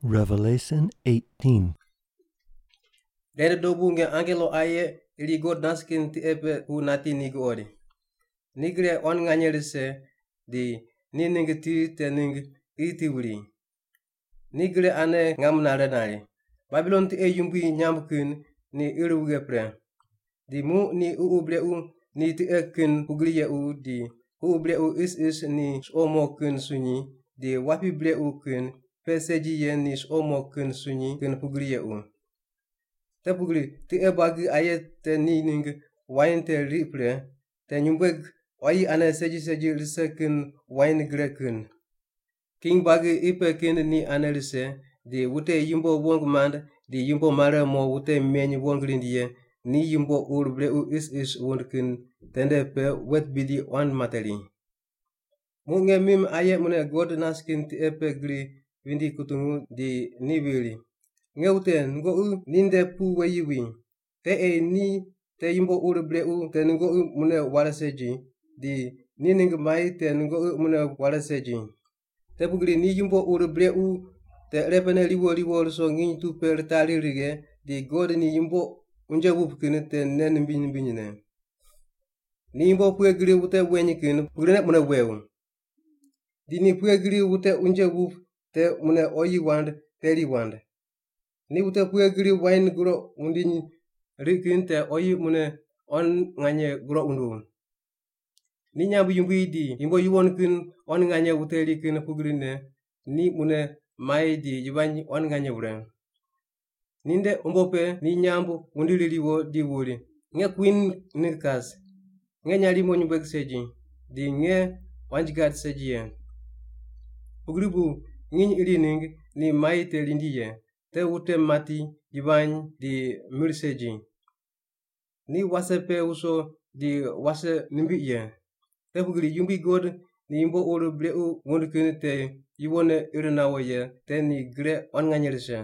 Ren nde dobu nge angelo aye iri God nas kin tiqe pe pu nati ni guqoid. Ni gre quan nganye rise di ni ningg ti te ningg qi ti wuri. Ni gre ane ngam nare nari, “Babilon tiqe yumbui nyamb kin ni ir wughe pre! Di muq ni ququ brequ ni tiqe kin pugri yequ di ququ brequ isis ni suqo mo kin sunyi, di wapi brequ kin pe segi ye ni suqo mo kin sunyi kin pugri yequ. Te pugri tiqe buagi aye te ni ningg wain te riq pre, te nyumbueg quayi ane segi segi rise kin wain gre kin. King buagi qi pe kin ni ane rise, di wute yumbo wong mand di yumbo mare mo wute meny wong rind ye ni yumbo ur brequ isis wund kin tende pe wet bidi quan materi.” Muq nge mim aye mune God nas kin tiqe pe gri vindi kutungu di ni viri, “Nge wute, nungoqi ninde pu weyi wi. Te ei ni te yumbo ur brequ te nungoqi mune ware segi, di ni ningg mai te nungoqi mune ware segi. Te pugri ni yumbo ur brequ te irepe riwo riwo ruso nginy tu pe ritari righe di God ni yumbo unje wup kin te nei nimbiny nimbinyne. Ni yumbo pughe gri wute weny kin pugrine mune wew. Di ni pughe gri wute unje wup te mune oyi wand teri wand. Ni wute pughe gri wain groq wundiny riq kin te oyi mune quan nganye groq wunduw. Ni nyamb yumbui di yumbo yuwon kin quan nganye wuteri kin pugrine ni mune mai di yivany quan nganye wure. Ninde umbo pe ni nyamb wundiri riwo di wuri, ‘Nge kwin ningg kas, nge nyarimo nyumbueg segi, di nge quanji gad segi ye.’ Pugri bu nginy iri ningg ni mai te rindi ye, te wute mati, yivany, di mir segi. Ni wase pe wuso di wase nimbiq ye. Te pugri Yumbui God ni yumbo ur brequ wund kin te yuwonne ir nawo ye te ni gre quan nganye rise.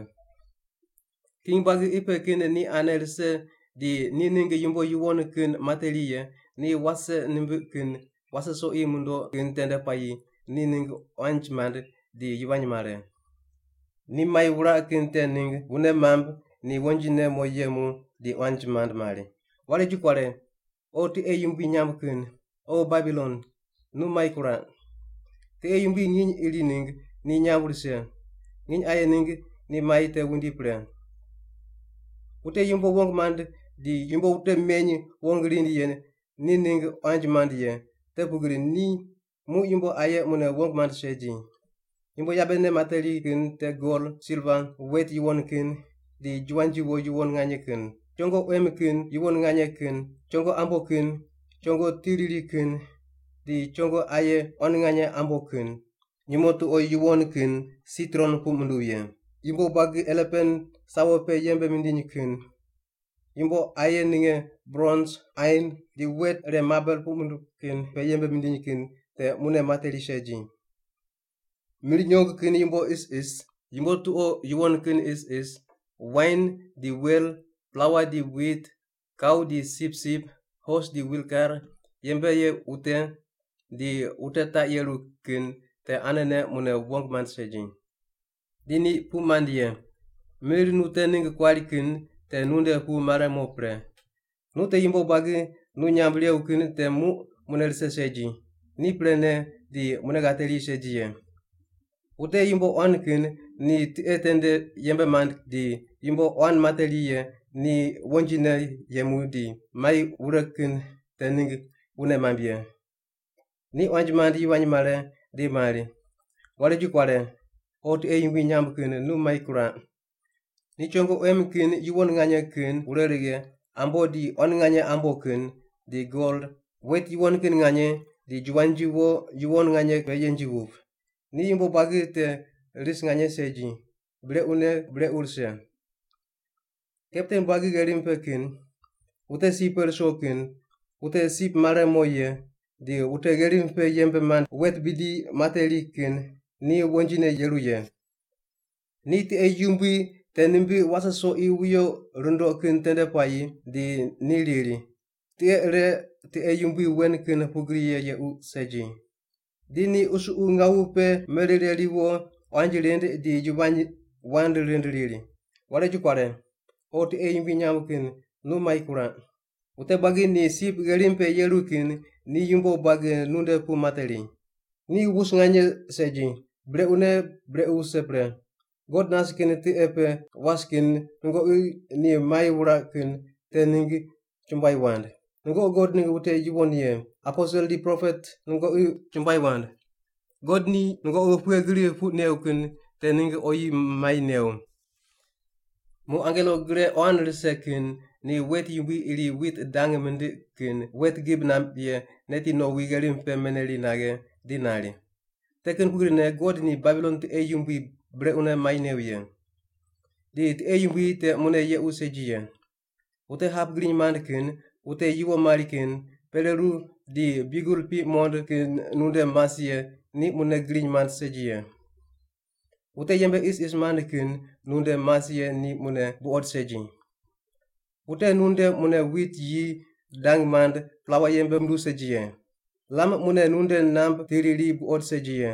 “King buagi qi pe kin ni ane rise di ni ningg yumbo yuwon kin materi ye ni wase nimbiq kin wase soqi mundoq kin tende puayi ni ningg quanji mand di yivany mare. Ni mai wuraq kin te ningg wune mamb, ni wonjine mo yemu di quanji mand mari, ‘Ware ju kuare! O tiqe yumbui nyamb kin, O Babilon, nu mai kuraq. Tiqe yumbui nginy iri ningg ni nyamb rise. Nginy aye ningg ni mai te wundi pre.’ “Wute yumbo wong mand di yumbo wute meny wong rind ye ni ni ningg quanji mand ye, te pugri ni muq yumbo aye mune wong mand segi. Yumbo yabene materi kin te gol, silva, wet yuwon kin, di juwanji wo yuwon nganye kin; chongo quem kin yuwon nganye kin, chongo ambo kin, chongo ti riri kin, di chongo aye quan nganye ambo kin; nyumo tuqo yuwon kin sitron puq munduw ye, yumbo buagi elepan sawo pe yembe mindiny kin, yumbo aye ninge brons, ain, di wet ire mabel puq munduw kin pe yembe mindiny kin te mune materi segi. Mir nyong kin yumbo isis, yumbo tuqo yuwon kin isis, wain di wel, plaua di wit, kau di sipsip, hos di wilkar, yembe ye wute di wute taq yeru kin te anene mune wong mand segi. “Di ni puq mand ye, ‘Mir nu te ningg kuari kin te nunde pu mare mo pre. Nu te yumbo buagi nu nyamb rew kin te muq mune rise segi, ni prene di mune ghateri segi ye.’ Wute yumbo quan kin ni tiqe tende yembe mand di yumbo quan materi ye ni wonjine yemu di mai wure kin te ningg wune mamb ye. Ni quanji mand yivany mare, di mari, ‘Ware ju kuare! O tiqe yumbui nyamb kin nu mai kuraq. Ni chongo quem kin yuwon nganye kin wure righe, ambo di quan nganye ambo kin, di gol, wet yuwon kin nganye, di juwanji wo yuwon nganye pe yenji wup. Ni yumbo buagi te ris nganye segi, brequne brequ rise!’ “Kapten buagi gherim pe kin, wute sip pe ruso kin, wute sip mare mo ye, di wute gherim pe yembe mand wet bidi materi kin, ni wonjine yeru ye. Ni tiqe yumbui te nimbiq wase soqi wuyo rundoq kin tende puayi di ni riri, ‘Tiqe ire tiqe yumbui wen kin pugri ye yequ segi.’ Di ni qusuqu ngawu pe merire riwo, quanji rind di yivany wand rind riri, ‘Ware ju kuare! O tiqe yumbui nyamb kin nu mai kuraq! Wute buagi ni sip gherim pe yeru kin ni yumbo buagi nunde pu materi. Ni wus nganye segi, brequne brequ wuse pre. God nas kin tiqe pe was kin nungoqi ni mai wuraq kin te ningg chumbuai wand. Nungoqi God ningg wute yuwon ye, aposel di propet nungoqi chumbuai wand. God ni nungoqi pughe gri puq weuq kin te ningg oyi mai new’.” Muq angelo gre quan rise kin ni wet yumbui iri wit dang mindiq kin wet gib namb ye neti nowi gherim pe meneri naghe di nari, “Te kin pugrine God ni Babilon tiqe yumbui brequne mai new ye. Di tiqe yumbui te mune yequ segi ye. Wute hap griny mand kin, wute yuwo mari kin, pereru di biugel piq muqond kin nunde mas ye ni mune griny mand segi ye. Wute yembe isis mand kin nunde mas ye ni mune buqod segi. Wute nunde mune wit yi dang mand plaua yembe munduw segi ye. Lam mune nunde namb ti riri buqod segi ye.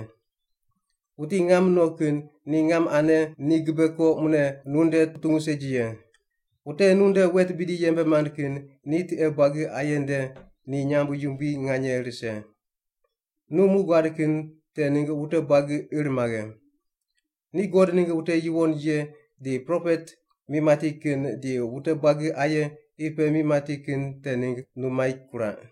Wuti ngam no kin ni ngam ane ni gibe ko mune nunde putungu segi ye. Wute nunde wet bidi yembe mand kin ni tiqe buagi aye nde ni nyamb yumbui nganye rise. Nu mu guad kin te ningg wute buagi ir maghe. Ni God ningg wute yuwon ye di propet mi mati kin di wute buagi aye qi pe mi mati kin te ningg nu mai kuraq.”